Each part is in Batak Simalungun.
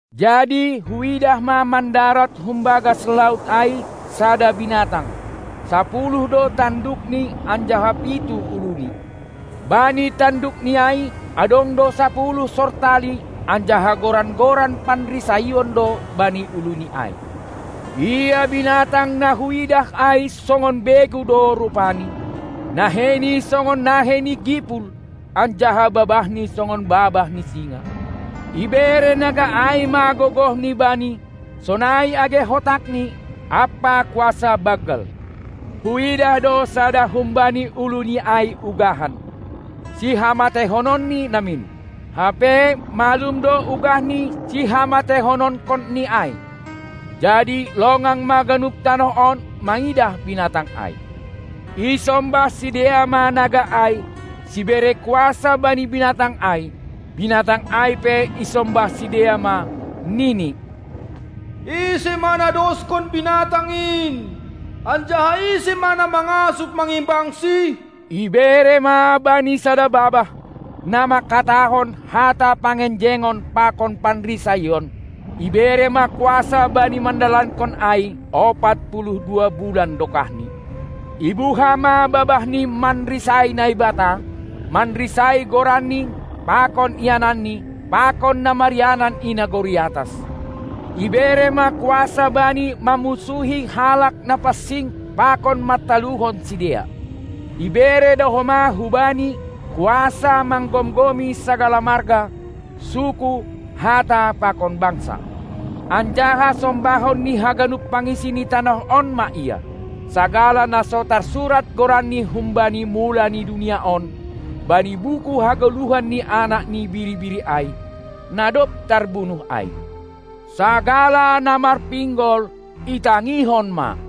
Jadi huidah ma mandarat humbagas laut ai sada binatang, sapuluh do tandukni anjaha pitu uluni. Bani tandukni ai adong do sapuluh sortali anjaha goran-goran panrisaion do bani uluni ai. Ia binatang na huidah ai songon begu do rupani, naheini songon nahei ni gipul anjaha babahni songon babah ni singa. Ibere naga ai ma gogohni bani, sonai age hotakni ampa kuasa banggal. Huidah do sada humbani uluni ai ugahan, sihamateihononni namin; hape malum do ugahni sihamateihononkonni ai. Jadi longang ma ganup tanoh on mangidah binatang ai. Isombah sidea ma naga ai, sibere kuasa bani binatang ai; binatang ai pe isombah sidea ma, nini: Ise ma na doskon binatang in, anjaha ise ma na mangasup mangimbangsi? Ibere ma bani sada babah, na mangkatahon hata pangenjengon pakon panrisaion; ibere ma kuasa bani mandalankon ai ompat puluh dua bulan dokahni. Ibuha ma babahni manrisai Naibata, manrisai goranNi pakon iananNi pakon na marianan i nagori atas. Ibere ma kuasa bani mammunsuhi halak na pansing pakon mantaluhon sidea; ibere do homa hubani kuasa manggomgomi sagala marga, suku, hata pakon bangsa. Anjaha sombahon ni haganup pangisi ni tanoh on ma ia, sagala na so tarsurat goranni humbani mula ni dunia on bani buku hagoluhan ni Anak ni Biri-biri ai, na dob tarbunuh ai. Sagala na marpinggol, itangihon ma!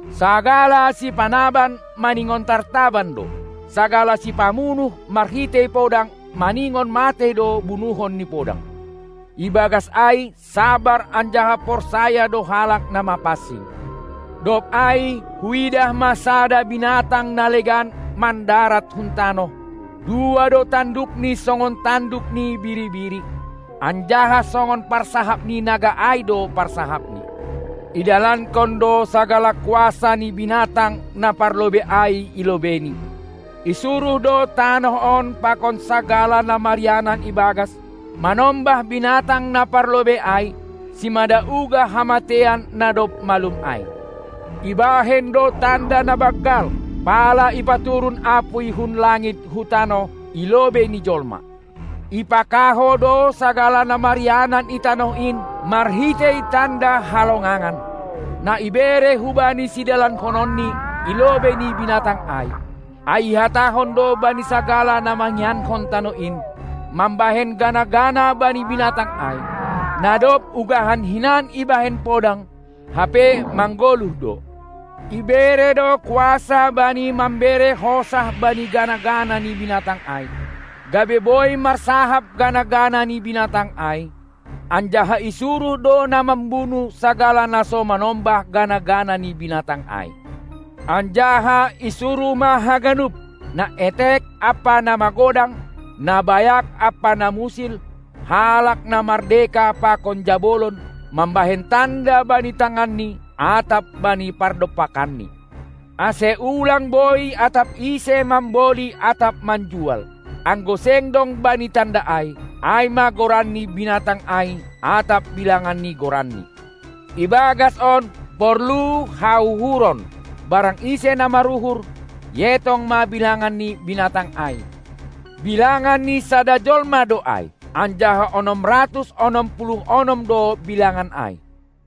Sagala sipanaban maningon tartaban do; sagala sipamunuh marhitei podang maningon matei do bunuhon ni podang. Ibagas ai sabar anjaha porsaya do halak na mapansing. Dob ai huidah ma sada binatang na legan mandarat hun tanoh, dua do tandukni songon tanduk ni biri-biri, anjaha songon parsahap ni naga ai do parsahapni. Idalankon do sagala kuasa ni binatang na parlobei ai i lobeini. Isuruh do tanoh on pakon sagala na marianan ibagas, manombah binatang na parlobei ai, simada ugah hamateian na dob malum ai. Ibahen do tanda na banggal, pala ipaturun apuy hun langit hu tanoh i lobei ni jolma. Ipakahou do sagala na marianan i tanoh in marhitei tanda halongangan, na ibere hubani sidalankononni i lobei ni binatang ai; ai ihatahon do bani sagala na mangiankon tanoh in, mambahen gana-gana bani binatang ai, na dob ugahan hinan ibahen podang, hape manggoluh do. Ibere do kuasa bani mambere hosah bani gana-gana ni binatang ai, gabe boi marsahap gana-gana ni binatang ai, anjaha isuruh do na mambunuh sagala na so manombah gana-gana ni binatang ai. Anjaha isuruh ma haganup, na etek ampa na magodang, na bayak ampa na musil, halak na mardeka pakon jabolon, mambahen tanda bani tanganni atap bani pardompakanni, ase ulang boi atap ise mamboli atap manjual, anggo seng dong bani tanda ai, ai ma goran ni binatang ai atap bilangan ni goranni. Ibagas on porlu hauhuron. Barang ise na maruhur, ietong ma bilangan ni binatang ai: Bilangan ni sada jolma do ai, anjaha onom ratus onom puluh onom do bilangan ai.